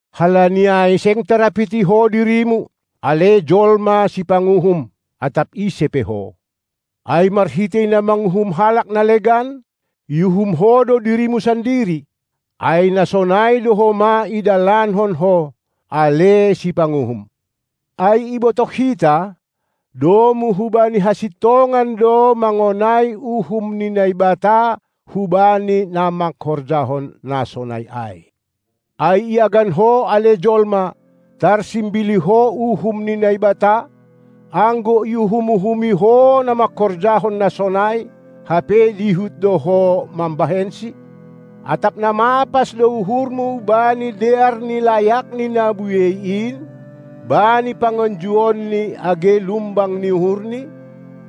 Halani ai seng tarapiti ho dirimu, ale jolma sipanguhum, atap ise pe ho. Ai marhitei na manguhum halak na legan, iuhum ho do dirimu sandiri, ai na sonai do homa idalankon ho, ale sipanguhum! Ai ibotoh hita, domu hubani hasintongan do mangonai uhum ni Naibata hubani na mangkorjahon na sonai ai. Ai iagan ho, ale jolma, tarsimbili ho uhum ni Naibata, anggo iuhum-uhumi ho na mangkorjahon na sonai, hape dihut do ho mambahensi? Atap na mapas do uhurmu bani dear ni layakNi na buei in, bani panganjuonNi age lumbang ni uhurNi?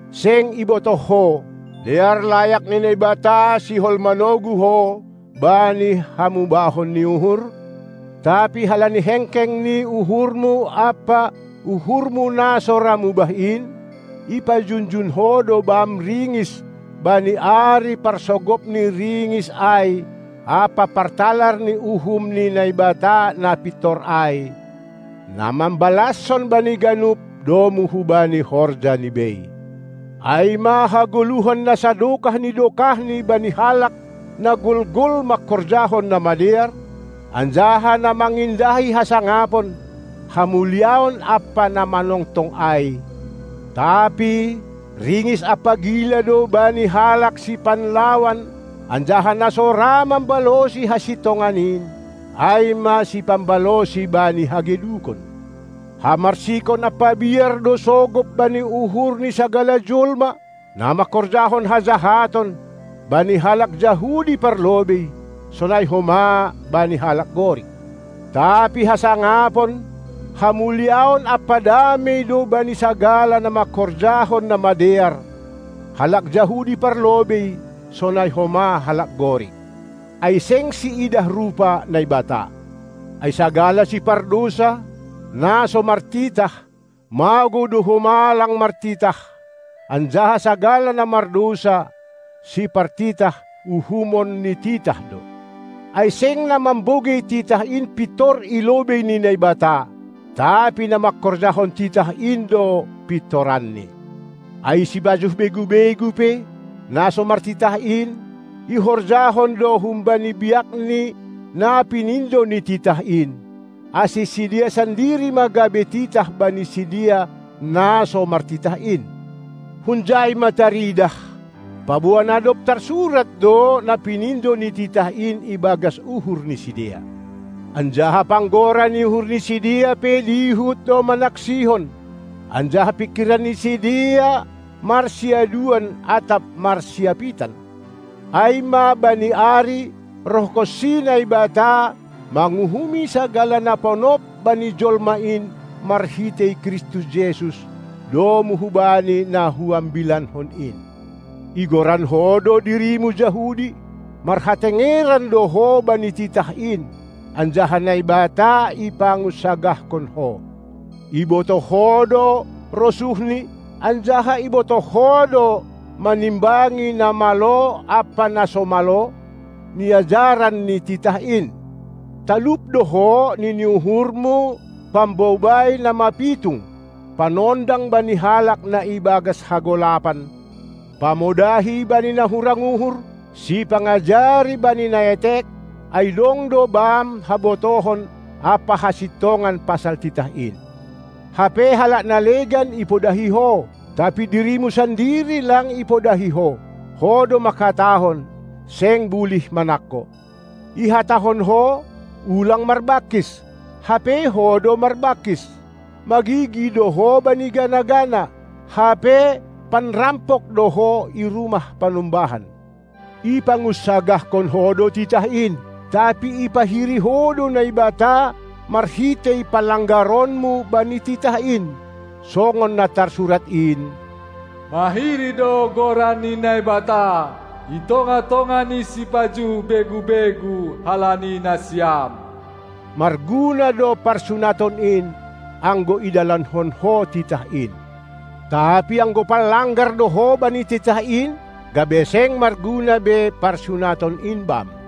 Seng ibotoh ho, dear layak ni Naibata sihol manogu ho bani hamubahon ni uhur? Tapi halani hengkeng ni uhurmu ampa uhurmu na so ra mubah in, ipajunjun ho do bam ringis bani ari parsogop ni ringis ai ampa partalar ni uhum ni Naibata na pintor ai, na mambalaskon bani ganup domu hubani horjani bei: Ai ma hagoluhan na sadokah ni dokahni bani halak na golgol mangkorjahon na madear, anjaha na mangindahi hasangapon, hamuliaon ampa na manongtong ai, tapi ringis ampa gila do bani halak sipanlawan anjaha na so ra mambalosi hasintongan in, ai ma sipambalosi bani hagedukon. Hamarsikon ampa biar do sogop bani uhur ni sagala jolma, na mangkorjahon hajahaton, bani halak Jahudi parlobei, sonai homa bani halak Gorik. Tapi hasangapon, hamuliaon ampa damei do bani sagala na mangkorjahon na madear, halak Jahudi parlobei, sonai homa halak Gorik. Ai seng siidah rupa Naibata. Ai sagala sipardousa, na so martitah, magou do homa lang martitah; anjaha sagala na mardousa, sipartitah, uhumon ni titah do. Ai seng na mambogei titah in pintor ilobei ni Naibata, tapi na mangkorjahon titah in do pintoranni. Ai sipajuh begu-begu pe, na so martitah in, ihorjahon do humbani biakni na pinindo ni titah in; ase sidea sandiri ma gabe titah bani sidea na so martitah in. Hunjai ma taridah, paboa na dob tarsurat do na pinindo ni titah in ibagas uhur ni sidea. Anjaha panggora ni uhur ni sidea pe dihut do manaksihon, anjaha pingkiran ni sideea marsiaduan atap marsiapitan, ai ma bani ari, rohkonsi Naibata, manguhumi sagala na ponop bani jolma in marhitei Kristus Jesus, domu hubani na huambilanhon in. Igoran ho do dirimu Jahudi, marhatengeran do ho bani titah in, anjaha Naibata ipangunsagahkon ho. Ibotoh ho do rosuhni, anjaha ibotoh ho do manimbangi na malo ampa na so malo, niajaran ni titah in. Talup do ho, nini uhurmu pambobai na mapitung, panondang bani halak na ibagas hagolapan, pamodahi bani na hurang uhur, sipangajari bani na etek, ai dong do bam habotohon ampa hasintongan pasal titah in. Hape halak na legan ipodahi ho, tapi dirimu sandiri lang ipodahi ho. Ho do mangkatahon, seng bulih manangko. Ihatahon ho, ulang marbangkis, hape ho do marbangkis. Magigi do ho bani gana-gana, hape panrampok do ho i rumah panumbahan. Ipangunsagahkon ho do titah in, tapi ipahiri ho do Naibata marhitei panlanggaronmu bani titah in. Songon na tarsurat in: Mahiri do goran ni Naibata i tongah-tongah ni sipajuh begu-begu halani nasiam. Marguna do parsunaton in, anggo idalankon ho titah in. Tapi anggo panlanggar do ho bani titah in, gabe seng marguna be parsunaton in bam.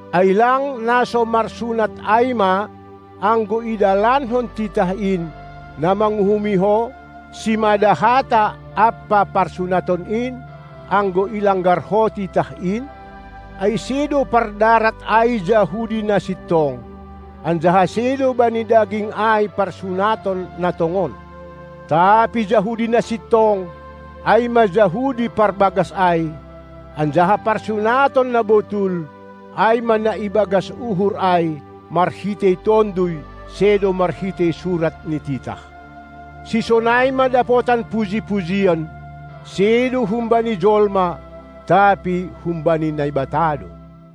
Ai lang na so marsunat ai ma, anggo idalankon titah in, na manguhumi ho, simada hata ampa parsunaton in, anggo ilanggar ho titah in? Ai sedo pardarat ai Jahudi na sintong, anjaha sedo bani daging ai parsunaton na tongon. Tapi Jahudi na sintong, ai ma Jahudi parbagas ai, anjaha parsunaton na botul, ai ma na ibagas uhur ai, marhitei Tonduy sedo marhitei surat ni titah. Sisonai ma dapotan puji-pujian, sedo humbani jolma, tapi humbani Naibata do.